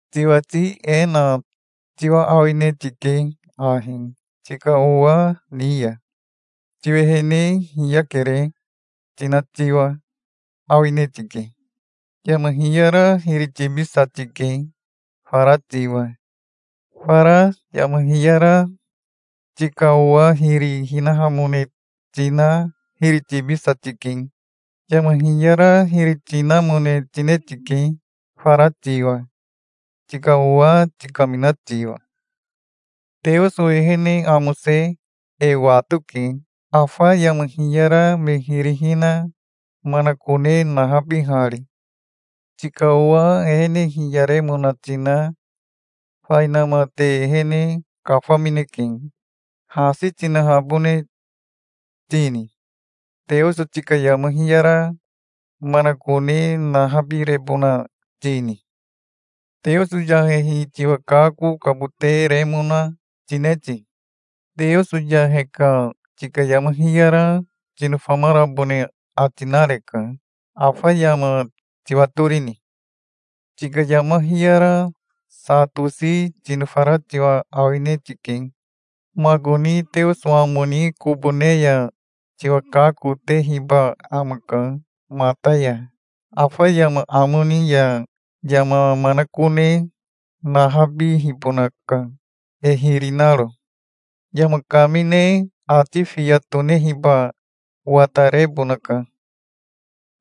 Tiwati e na tiwa awine tike ahi tika owa ni ya: "Tiwehene hiyakere", tina tiwa awine tike. Yama hiyara hiri tibisa tike fara tiwa. Fara yama hiyara tika owa hiri hinahamone tina hiri tibisa tike. Yama hiyara hiri tinamone tine tike fara tiwa, tika owa tikamina tiwa. Teoso ehene amose e watoke, afa yama hiyara me hiri hina manakone nahabihari. Tika owa ehene hiyaremona tina fainama te ehene kafamineke. Hasi tinahabone tini? Teoso tika yama hiyara manakone nahabirebona tini? Teoso yahehi tiwa kakokabote remona tine ti? Teoso yahe ka tika yama hiyara tinofamarabone ati nareka. Afa yama tiwatorini? Tika yama hiyara sa tosi tinofara tiwa awine tike. Makoni Teoso amo ni kobo ne ya tiwa kakotehiba amaka mata ya. Afa yama amo ni ya yama manakone nahabihibonaka, e hiri naro. Yama kamine ati fiya tonehiba watarebonaka.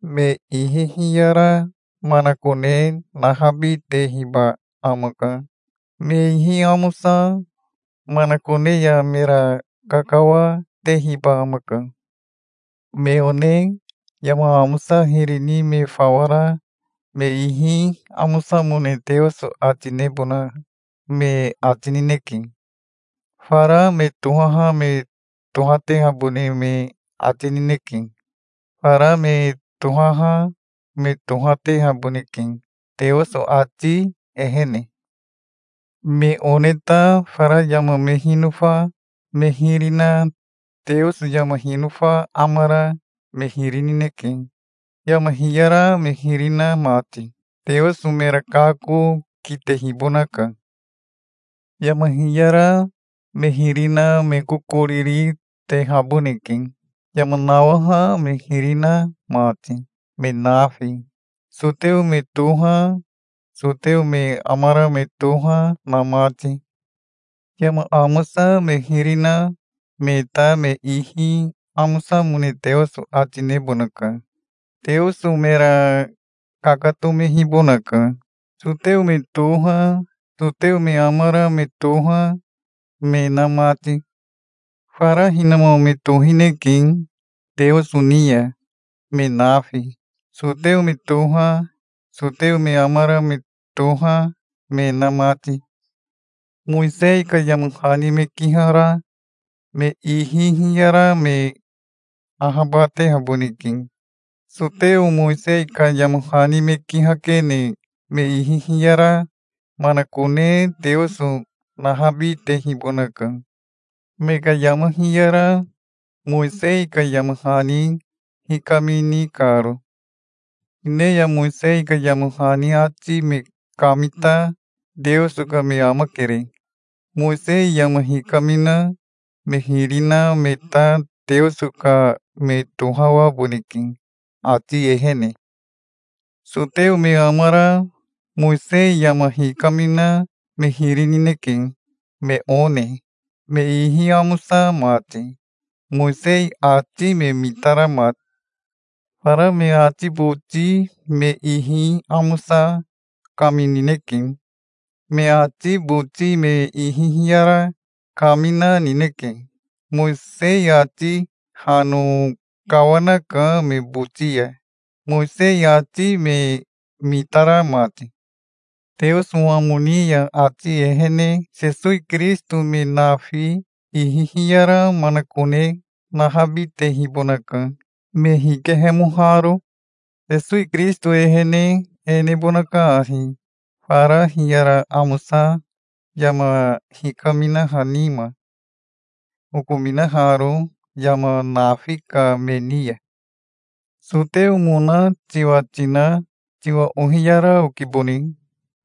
Me ihi hiyara manakone nahabitehiba amaka. Me ihi amosa manakone ya mera kakawa, tehiba amaka. Me one yama amosa hiri ni me fawa ra me ihi amosamone Teoso ati nebona me ati nineke. Fara me tohaha me tohatehabone me ati nineke. Fara me tohaha me tohatehaboneke, Teoso ati ehene. Me one ta fara yama me hinofa me hiri na Teoso yama hinofa amara me hiri nineke, yama hiyara me hiri na mati. Teoso mera kako kitehibonaka. Yama hiyara me hiri na me kokoriri tehaboneke, yama nawaha me hiri na mati, me nafi, soteo me toha, soteo me amara me toha na mati. Yama amosa me hiri na me ta me ihi amosamone Teoso ati nebonaka. Teoso mera kakatomehibonaka, soteo me toha, soteo me amara me toha me na mati. Fara hinama me tohineke Teoso ni ya, me nafi, soteo me toha, soteo me amara me toha me na mati. Mowisei ka yama hani me kihara me ihi hiyara me ahabatehaboneke. Soteo Mowisei ka yama hani me kihakene me ihi hiyara manakone Teoso nahabitehibonaka, me ka yama hiyara Mowisei ka yama hani hikamini karo. Hine ya Mowisei ka yama hani ati me kamita Teoso ka me amakere. Mowisei yama hikamina me hiri na me ta Teoso ka me tohawaboneke ati ehene. Soteo me amara Mowisei yama hikamina me hiri nineke, me one, me ihi amosa mati, Mowisei ati me mitara mati. Fara me ati boti me ihi amosa kaminineke. Me ati boti me ihi hiyara kamina nineke. Mowisei ati hano kawanaka me boti ya, Mowisei ati me mitara mati. Teoso amo ni ya ati ehene Sesowi Kirisito me nafi ihi hiyara manakone nahabitehibonaka, me hikehemoharo. Sesowi Kirisito ehene e nebonaka ahi fara hiyara amosa yama hikaminaha nima, okominaharo yama nafi ka me ni ya. Soteomona tiwa tina tiwa ohiyara okibone.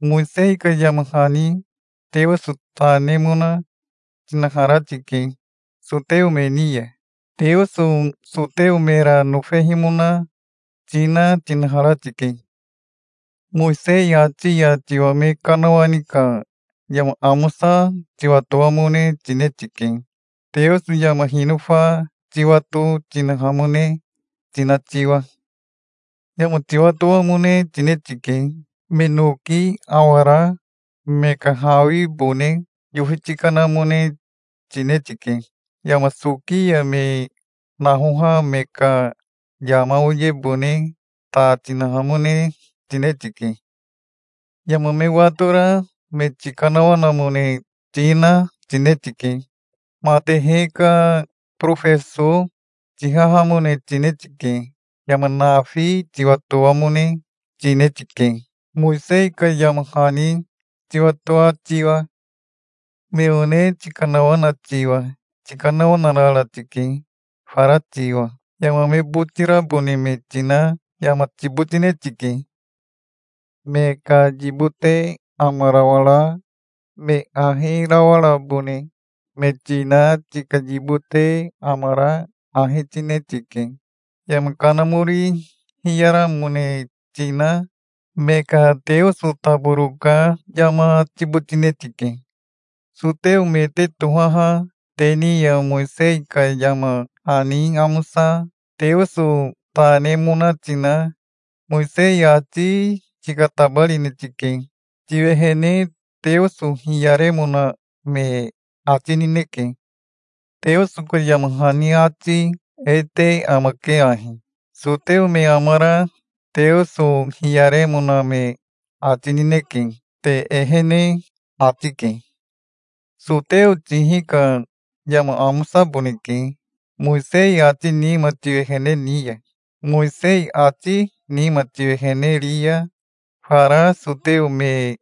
Mowisei ka yama hani Teoso ta nemona tinahara tike, soteo me ni ya. Teoso soteo mera nofehimona tina tinahara tike. Mowisei ati ya tiwa me kanawani ka yama amosa tiwatoamone tine tike, Teoso yama hinofa tiwato tinahamone tina tiwa. Yama tiwatoamone tine tike. Me noki awara me ka hawibone yofi tikanamone tine tike. Yama soki ya me nahoha me ka yama oyebone ta tinahamone tine tike. Yama me watora me tikanawanamone tina tine tike. Matehe ka borofeso tihahamone tine tike. Yama nafi tiwatoamone tine tike, Mowisei ka yama hani tiwatoa tiwa. Me one tikanawana tiwa tikanawanarara tike fara tiwa. Yama me botirabone me tina yama tibotine tike. Me ka yibote amarawara me ahi rawarabone me tina tika yibote amara ahi tine tike. Yama kanamori hiyaramone tina me ka teoso taboro ka yama tibotine tike. Soteo me te tohaha te ni ya Mowisei ka yama hani amosa Teoso ta nemona tina Mowisei ati tikatabarine tike. Tiwehene Teoso hiyaremona me ati nineke. Teoso ka yama hani ati e te amake ahi: "Soteo me amara Teoso hiyaremona me ati nineke, te ehene", ati ke. Soteo tihi ka yama amosaboneke, Mowisei ati nima tiwehene ni ya. Mowisei ati nima tiwehene ri ya, fara soteo me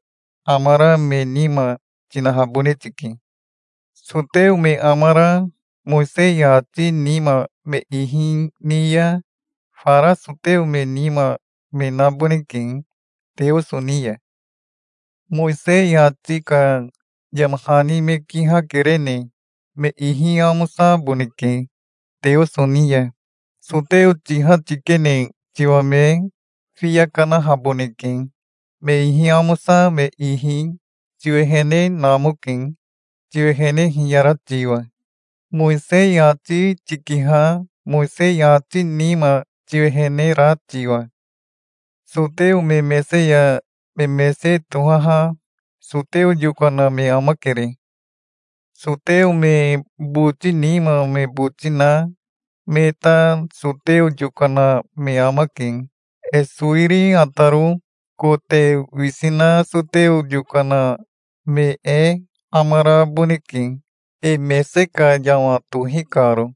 amara me nima tinahabone tike. Soteo me amara Mowisei ati nima me ihi ni ya fara soteo me nima me naboneke Teoso ni ya. Mowisei ati ka yama hani me kihakerene me ihi amosaboneke Teoso ni ya. Soteo tiha tikene tiwa me fiya kanahaboneke. Me ihi amosa me ihi tiwehene namoke tiwehene hiyara tiwa, Mowisei ati tikiha Mowisei ati nima tiwehene ra tiwa. Soteo me mese ya me mese tohaha soteo yokana me amakere. Soteo me boti nima me boti na me ta soteo yokana me amake. E sowiri ataro kote wisi na soteo yokana me e amaraboneke, e mese ka yama tohi karo.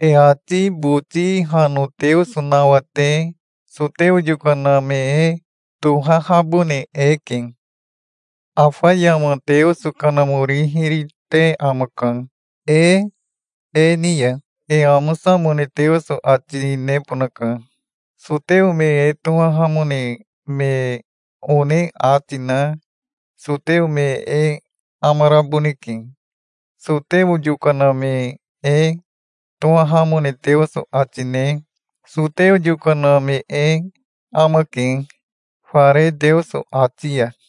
E ati boti hano Teoso nawate soteo yokana me e tohahabone eke. Afa yama Teoso Kanamori hiri te amaka. E e ni ya e amosamone Teoso ati nebonaka. Soteo me e tohahamone me one ati na soteo me e amaraboneke. Soteo yokana me e tohahamone Teoso ati ne soteo yokana me e amake, fare Teoso ati ya.